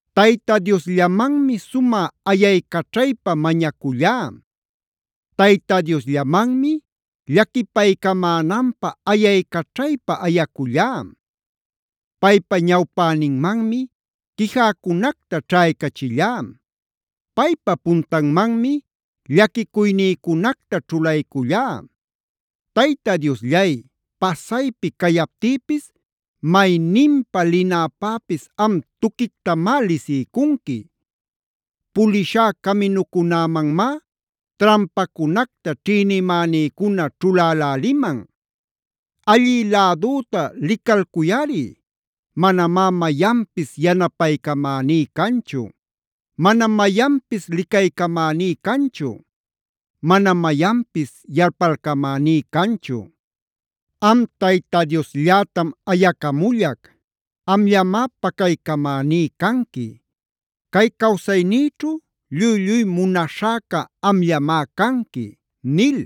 Tayta Diosllamanmi sumä ayaycaćhaypa mañacullá. Tayta Diosllamanmi llaquipaycamänanpä ayaycaćhaypa ayacullá. Paypa ñawpäninmanmi quijäcunacta ćhaycachillá. Paypa puntanmanmi llaquicuynïcunacta ćhulaycullá. Tayta Diosllay, pasaypi cayaptïpis mayninpa linäpäpis am tuquictamá lisiycunqui. Pulishá caminücunämanmá trampacunacta ćhïnimänïcuna ćhuläläliman. Allï lädüta licalcuyꞌari; manamá mayanpis yanapaycamäní canchu. Manam mayanpis licaycamäní canchu. Manam mayanpis yalpalcamäní canchu. Am Tayta Diosllätam ayacamullac: “Amllamá pacaycamäní canqui. Cay cawsaynïćhu lluy-lluy munaśhäca amllamá canqui” nil.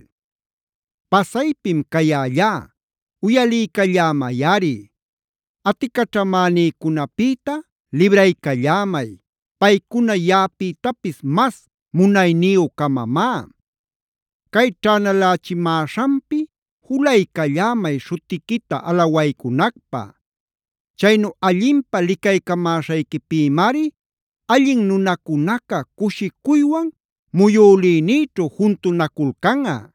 Pasaypim cayällá, uyaliycallämayꞌari. Aticaćhamänïcunapïta libraycallämay, paycuna yaꞌapïtapis mas munayniyü-camamá. Cay ćhänalächimäśhanpi julaycallämay śhutiquita alawaycunacpä. Chaynu allinpä licaycamäśhayquipïmari allin nunacunaca cushicuywan muyülïnïćhu juntunaculcanꞌa.